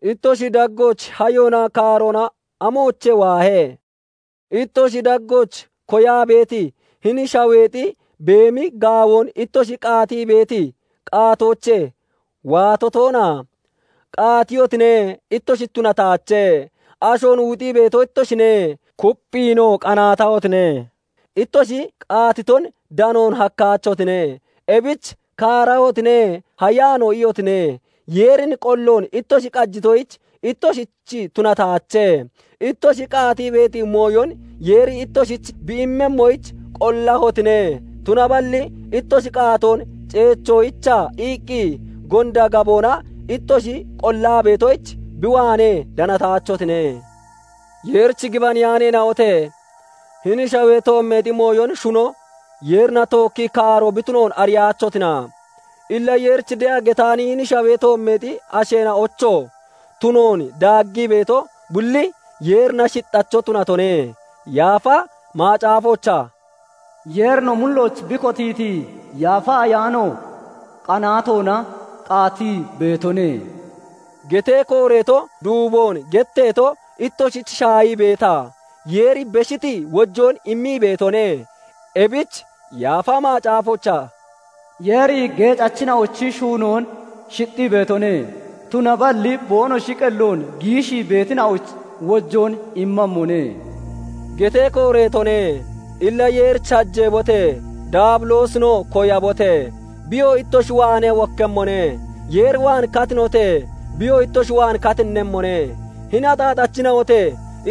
Ittoshi daggooch hayoonaa kaaroona amoochee waahe? Ittoshi daggooch koyaa beeti, hini shaweexi beemi gaawoon ittoshi qaatii beeti qaatoochee waato toona? Qaatiyotine; ittoshich tunataache; ashoon wuxii beeto ittoshine; kupphiinoo qanaatahotine; ittoshi qaatiton danoon hakkaachotine. Ebich kaarahotine; hayaanoo iyotine; Yeerin qolloon ittoshi qajitoyich, ittoshich tunataache. Ittoshi qaatii beeti mooyon Yeeri ittoshich bi immemmoyich qollahotine; tunaballi ittoshi qaatoon ceechoyicha iqqi gonda gaboona ittoshi qollaa beetoyich, bi waanee danataachotine. Yeerich gibaneyaaneena'ote! Hini shawee toommeexi mooyon shuno Yeerina tookkii kaaro bi tunoon ariyaachotina? Illa Yeerich de'a getaani hini shawee toommeexi asheena'ocho tunoon daaggii beeto bulli, Yeerina shixacho tunatone. Yaafa Macaafoochaa "Yeeri no mullooch bi kotiiti Yaafa Ayaano qanaatoona qaatii beetone" getee kooreeto duuboon getteeto ittoshich shaahii beeta? Yeeri beshiti wojoon immii beetone; ebich Yaafa Macaafoochaa "Yeeri geecachina'ochi shuunoon shixxii beetone; tunaballi boonoshi qelloon giishii beetina'oyich wojoon immemmone" getee kooreetone. Illa Yeerich hajeebote! Daabiloosinoo koyabote! Biyoo ittoshi waanee wokkemmone. Yeer waan katinote! Biyoo ittoshi waan katinnemmone. Hini axaaxachina'ote!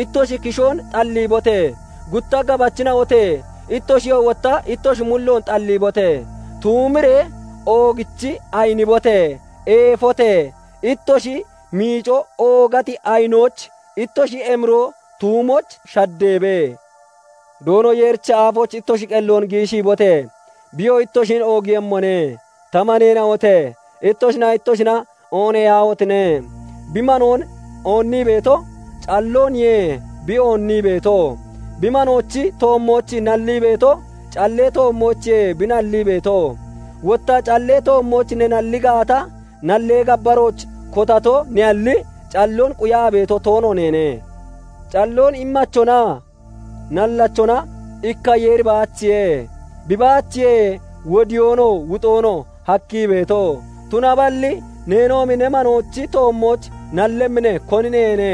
Ittoshi kishoon xalliibote! Gutta gabachina'ote! Ittoshiyoo wotta ittoshi mulloon xalliibote! Tuumiree oogichi ayinibote! Eefote! Ittoshi miico oogati ayinooch, ittoshi emiroo tuumooch shaddeebe! Doono Yeerichi aafooch ittoshi qelloon giishiibote! Biyoo ittoshin oogiiyemmone. Ta maneena'ote! Ittoshinaa ittoshina ooneyaahotine! Bi manoon oonnii beeto, callooniye bi oonnii beeto; bi manoochi toommooch nallii beetoo, callee toommoochiye bi nallii beeto. Wotta callee toommooch ne nalli gaata, nallee gabbarooch kotato ne'alli, calloon quyaa beeto toono neene. Calloon immachonaa nallachona ikka Yeeri baachiye; bi baachiye wodiyoonoo wuxoonoo hakkii beeto; tunaballi neenoomi ne manoochi toommooch nallemmi ne, koni neene?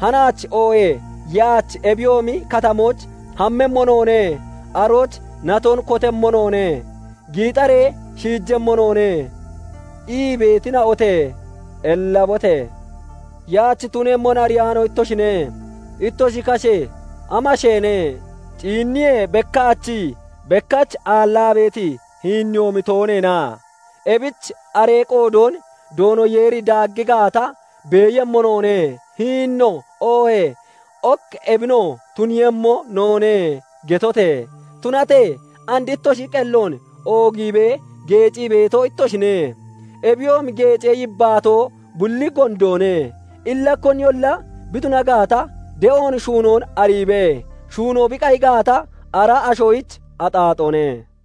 "Hanaach oohee yaach ebiyoomi katamooch hammemmo noone; arooch naton kotemmo noone; giixaree shiijemmo noone" ii beetina'ote! Ellabote! Yaach tunemmon ariyaano ittoshine. Ittoshi kashe amasheene? Ciinniyee bekkaachii, bekkach aallaa beeti hiinneyoomi tooneena? Ebich aree qoodoon "Doono Yeeri daaggii gaata, beeyemmo noone; hininoo, oohee ok ebinoo tuniiyemmo noone" getote! Tunatee and ittoshi qelloon oogiibee geecii beeto ittoshine; ebiyoomi geecee yibbaatoo bulli gondoone. Illa koniyolla bi tuna gaata, de'oon shuunoon ariibee shuuno bi qayi gaata, ara ashoyich axaaxoone.